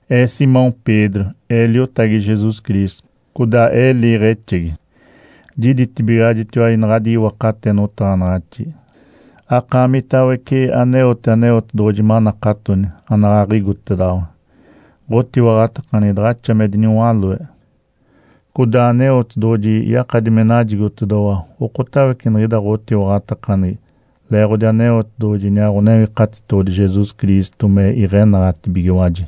Ee, Simão Pedro, ee liotagi Jesus Cristo, codaa ee liiɡ̶exegi. Jiditibigaɡ̶ajitiwaji naɡ̶adi iwakate notaɡ̶anaɡ̶axi, akaamitawece aneote Aneotedoɡ̶oji manakatoni, anaɡ̶aɡ̶a igotedoɡ̶owa. Ǥotiwaɡ̶atakaneɡ̶egi daɡ̶axa me diniwaloe, codaa Aneotedoɡ̶oji yakadi me najigotedoɡ̶owa okotawece niɡ̶ida ɡ̶otiwaɡ̶atakaneɡ̶egi leeɡ̶odi Aneotedoɡ̶oji iniaa Ǥonewikatitoɡ̶odi Jesus Cristo me iɡ̶enaɡ̶atibigiwaji.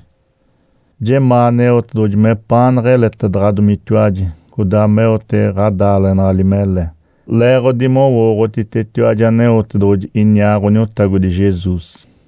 Jemaa Aneotedoɡ̶oji mepaanaɡ̶a eletedaɡ̶adomitiwaji, codaa meote ɡ̶adaaleɡ̶enali mele, leeɡ̶odi mowooɡ̶otitetiwaji Aneotedoɡ̶oji iniaa Ǥoniotagodi Jesus.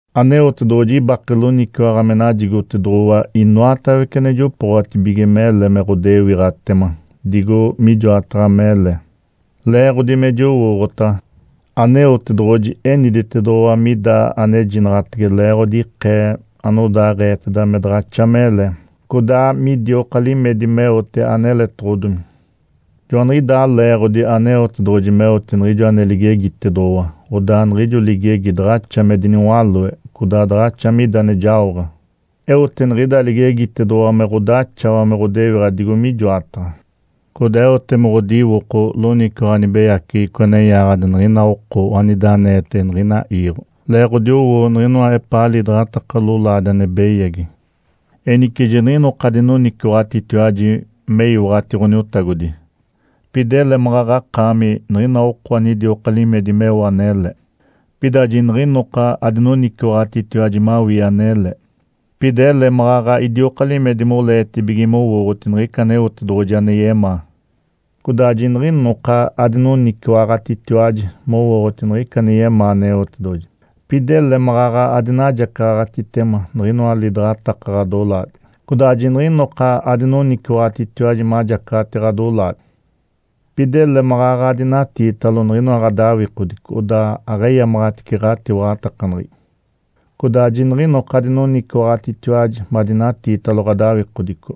Aneotedoɡ̶oji ibake loniciwaɡ̶a me najigotedoɡ̶owa inoatawece ane jopooɡ̶atibige mele me ɡ̶odewiɡ̶atema digo mijoataɡ̶a mele, leeɡ̶odi me jowooɡ̶otaɡ̶a. Aneotedoɡ̶oji eniditedoɡ̶owa mida anejinaɡ̶atege leeɡ̶odi ikee anodaaɡ̶eeteda me daɡ̶axa mele, codaa midioka limedi meote aneletoɡ̶odomi. Joaniɡ̶idaa leeɡ̶odi Aneotedoɡ̶oji meote niɡ̶ijo ane ligegitedoɡ̶owa, odaa niɡ̶ijo ligegi daɡ̶axa me diniwaloe, codaa daɡ̶axa mida ane jaoɡ̶a. Eote niɡ̶ida ligegitedoɡ̶owa me ɡ̶odaxawa me ɡ̶odewiɡ̶a digo mijoataɡ̶a, codaa eote me ɡ̶odiwoko loniciwaɡ̶a nibeyaceɡ̶eco ane yaaɡ̶adi niɡ̶ina oko anida aneetege niɡ̶ina iiɡ̶o leeɡ̶odi owo niɡ̶inoa epaa lidaɡ̶ataka lolaadi ane beyagi. Enice jiniɡ̶inoka adinoniciwaɡ̶atitiwaji me iwaɡ̶ati Ǥoniotagodi, pida ele maɡ̶aɡ̶akaami niɡ̶ina oko anidioka limedi meo anele. Pida jiniɡ̶inoka adinoniciwaɡ̶atitiwaji mawii anele, pida ele maɡ̶aɡ̶a idioka limedi moleetibige mowooɡ̶oti niɡ̶ica Aneotedoɡ̶oji ane yemaa. Codaa jiniɡ̶inoka adinoniciwaɡ̶atitiwaji mowooɡ̶oti niɡ̶ica ane yemaa Aneotedoɡ̶oji, pida ele maɡ̶aɡ̶a adinajacaɡ̶atitema niɡ̶inoa lidaɡ̶ataka ɡ̶odolaadi. Codaa jiniɡ̶inoka adinoniciwaɡ̶atitiwaji majacaɡ̶ati ɡ̶adolaadi, pida ele maɡ̶aɡ̶a adinatiitalo niɡ̶inoa ɡ̶adawikodico odaa aɡ̶eyamaɡ̶atice ɡ̶atiwaɡ̶atakaneɡ̶egi. Codaa jiniɡ̶inoka adinoniciwaɡ̶atitiwaji madinatiitalo ɡ̶adawikodico,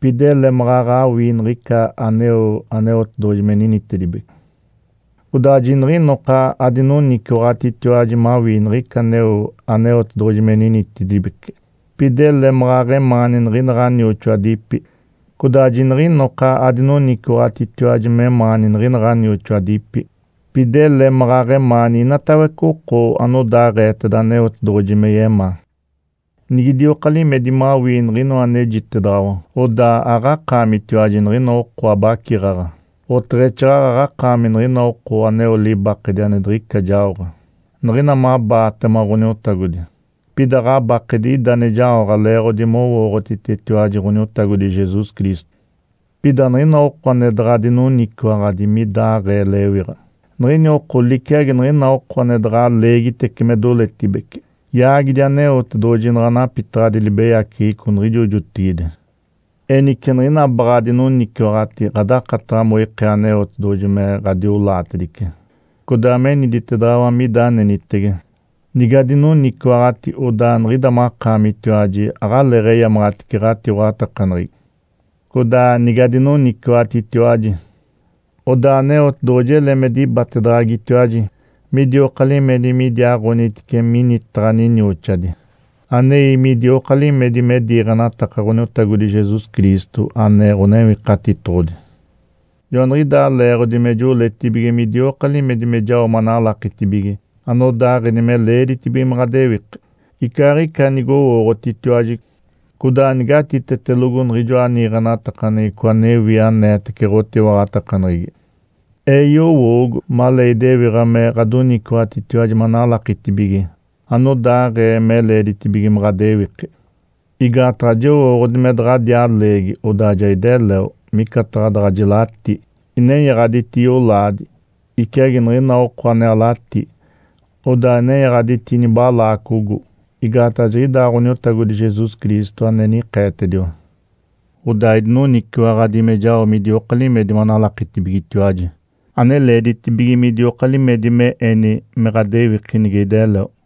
pida ele maɡ̶aɡ̶a awii niɡ̶ica aneo Aneotedoɡ̶oji me ninitedibece. Codaa jiniɡ̶inoka adinoniciwaɡ̶atitiwaji mawii niɡ̶ica aneo Aneotedoɡ̶oji me ninitedibece, pida ele maɡ̶aɡ̶emaani niɡ̶ina ɡ̶anioxoadipi. Codaa jiniɡ̶inoka adinoniciwaɡ̶atitiwaji memaani niɡ̶ina ɡ̶anioxoadipi, pida ele maɡ̶aɡ̶a emaani inatawece oko anodaaɡ̶eeteda Aneotedoɡ̶oji me yemaa. Nigidioka limedi mawii niɡ̶inoa anejitedaɡ̶awa, odaa aɡ̶akaamitiwaji niɡ̶ina oko abaciɡ̶aɡ̶a, oteɡ̶exaaɡ̶aɡ̶a akaami niɡ̶ina oko aneo libakedi ane diɡ̶ica jaoɡ̶a, niɡ̶ina mabaatema Ǥoniotagodi. Pida ɡ̶abakedi ida ane jaoɡ̶a leeɡ̶odi mowooɡ̶otitetiwaji Ǥoniotagodi Jesus Cristo. Pida niɡ̶ina oko ane daɡ̶a dinoniciwaɡ̶adi midaɡ̶aee lewiɡ̶a, niɡ̶ini oko liciagi niɡ̶ina oko ane daɡ̶a leegitece me doletibece. Yaagidi Aneotedoɡ̶oji naɡ̶a napitaɡ̶adi libeyaceɡ̶eco niɡ̶ijo jotigide. Enice niɡ̶ina baɡ̶a adinoniciwaɡ̶ati ɡ̶adakataɡ̶a moikee Aneotedoɡ̶oji me ɡ̶adiolaatedice, codaa meniditedaɡ̶awa mida anenitege. Nigadoniciwaɡ̶ati, odaa niɡ̶ida makaamitiwaji aɡ̶aleeɡ̶eyamaɡ̶atice ɡ̶atiwaɡ̶atakaneɡ̶egi. Codaa nigadinoniciwaɡ̶atitiwaji, odaa Aneotedoɡ̶oji ele me dibatedaɡ̶agitiwaji midioka limedi midiaaɡ̶onitice minitaɡ̶a ninioxadi, anei midioka limedi me diiɡ̶enataka Ǥoniotagodi Jesus Cristo, ane Ǥonewikatitoɡ̶odi. Joaniɡ̶idaa leeɡ̶odi me joletibige midioka limedi me jao manalakitibige anodaaɡ̶eni me leeditibige me ɡ̶adewiki, icaaɡ̶ica nigowooɡ̶otitiwaji, codaa nigatitetelogo niɡ̶ijoa niiɡ̶enatakaneɡ̶eco anewi aneetece ɡ̶otiwaɡ̶atakaneɡ̶egi. Ee yowoogo, malee idewiɡ̶a me ɡ̶adoniciwaɡ̶atitiwaji manalakitibige anodaaɡ̶ee me leeditibige me ɡ̶adewiki. Igaataɡ̶a jowooɡ̶odi me daɡ̶adiaa leegi, odaa ja ideleo, micataɡ̶a daɡ̶a jilatí, inenyaɡ̶aditi yolaadi, iciagi niɡ̶ina oko ane alatí, odaa nenyaɡ̶aditi nibalaacogo. Igaataɡ̶a jiɡ̶idaa Ǥoniotagodi Jesus Cristo ane nikeetediwa. Odaa idinoniciwaɡ̶adi me jao midioka limedi manalakitibigetiwaji ane leeditibige midioka limedi me eni me ɡ̶adewiki, nige ideleo.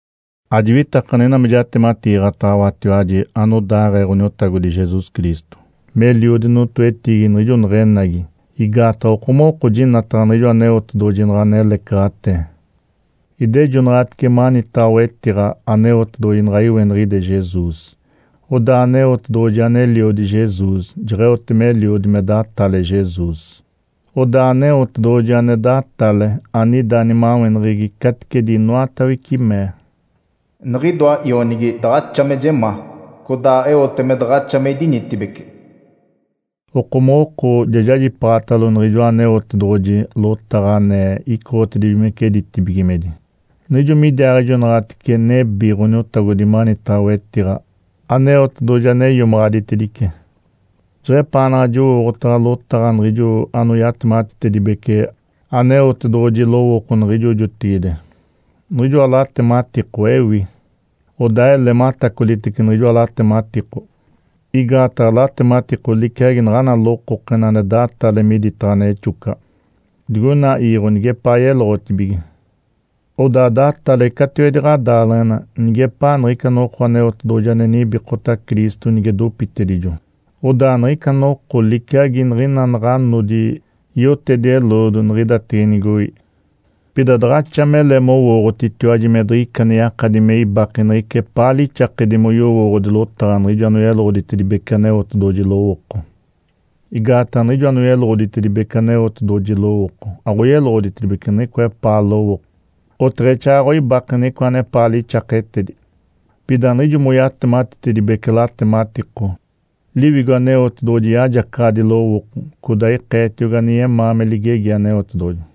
Ajiwitakaɡ̶a niɡ̶ina me jatematiiɡ̶ataɡ̶awatiwaji anodaaɡ̶ee Ǥoniotagodi Jesus Cristo meliodi notoetiigi niɡ̶ijo neɡ̶enagi. Igaataɡ̶a okomoɡ̶oko jinataɡ̶a niɡ̶ijo Aneotedoɡ̶oji naɡ̶a nelecaɡ̶atee. Idejonaɡ̶atice manitaɡ̶a wetiɡ̶a Aneotedoɡ̶oji naɡ̶a iweniɡ̶ide Jesus. Odaa Aneotedoɡ̶oji ane Eliodi Jesus jeɡ̶eote meliodi me datale Jesus. Odaa Aneotedoɡ̶oji ane datale, anida nimaweneɡ̶egi caticedi inoatawece, mee, “Niɡ̶idoa Ionigi daɡ̶axa me jemaa. Codaa eote me daɡ̶axa me idinitibece.” Okomoɡ̶oko jajipaaɡ̶atalo niɡ̶ijoa Aneotedoɡ̶oji lotaɡ̶a ane icoɡ̶otibigimece ditibigimedi, niɡ̶ijo midiaaɡ̶ejonaɡ̶atice nebi Ǥoniotagodi manitaɡ̶a wetiɡ̶a, Aneotedoɡ̶oji ane iomaɡ̶aditedice. Jeɡ̶epaanaɡ̶a jowooɡ̶otaɡ̶a lotaɡ̶a niɡ̶ijo anoyatematitedibece Aneotedoɡ̶oji lowooko niɡ̶ijo jotigide, niɡ̶ijoa latematiko ewi. Odaa ele matacolitece niɡ̶ijoa latematiko. Igaataɡ̶a latematiko liciagi naɡ̶ana lokokena ane datale miditaɡ̶a nexocaɡ̶a digoina iiɡ̶o nigepaa yeloɡ̶otibige. Odaa datale catiwedi ɡ̶adaaleɡ̶ena nigepaa niɡ̶ica noko Aneotedoɡ̶oji ane nibikota Cristo nige dopitedijo. Odaa niɡ̶ica noko liciagi niɡ̶ina naɡ̶a nodi yotedi-eloodo niɡ̶idatege nigoi. Pida daɡ̶axa mele mowooɡ̶otitiwaji me diɡ̶ica ane yakadi me ibake niɡ̶ica epaa lixakedi me yowooɡ̶odi lotaɡ̶a niɡ̶ijo anoyeloɡ̶oditedibece Aneotedoɡ̶oji lowooko. Igaataɡ̶a niɡ̶ijo anoyeloɡ̶oditedibece Aneotedoɡ̶oji lowooko aɡ̶oyeloɡ̶oditedibece niɡ̶icoa epaa lowooko, oteɡ̶exaaɡ̶aɡ̶a oibake niɡ̶icoa anepaa lixaketedi. Pida niɡ̶ijo moyatematitedibece latematiko, Liwigo Aneotedoɡ̶oji yajacaɡ̶adi lowooko, codaa ikeetiogi ane yemaa me ligegi Aneotedoɡ̶oji.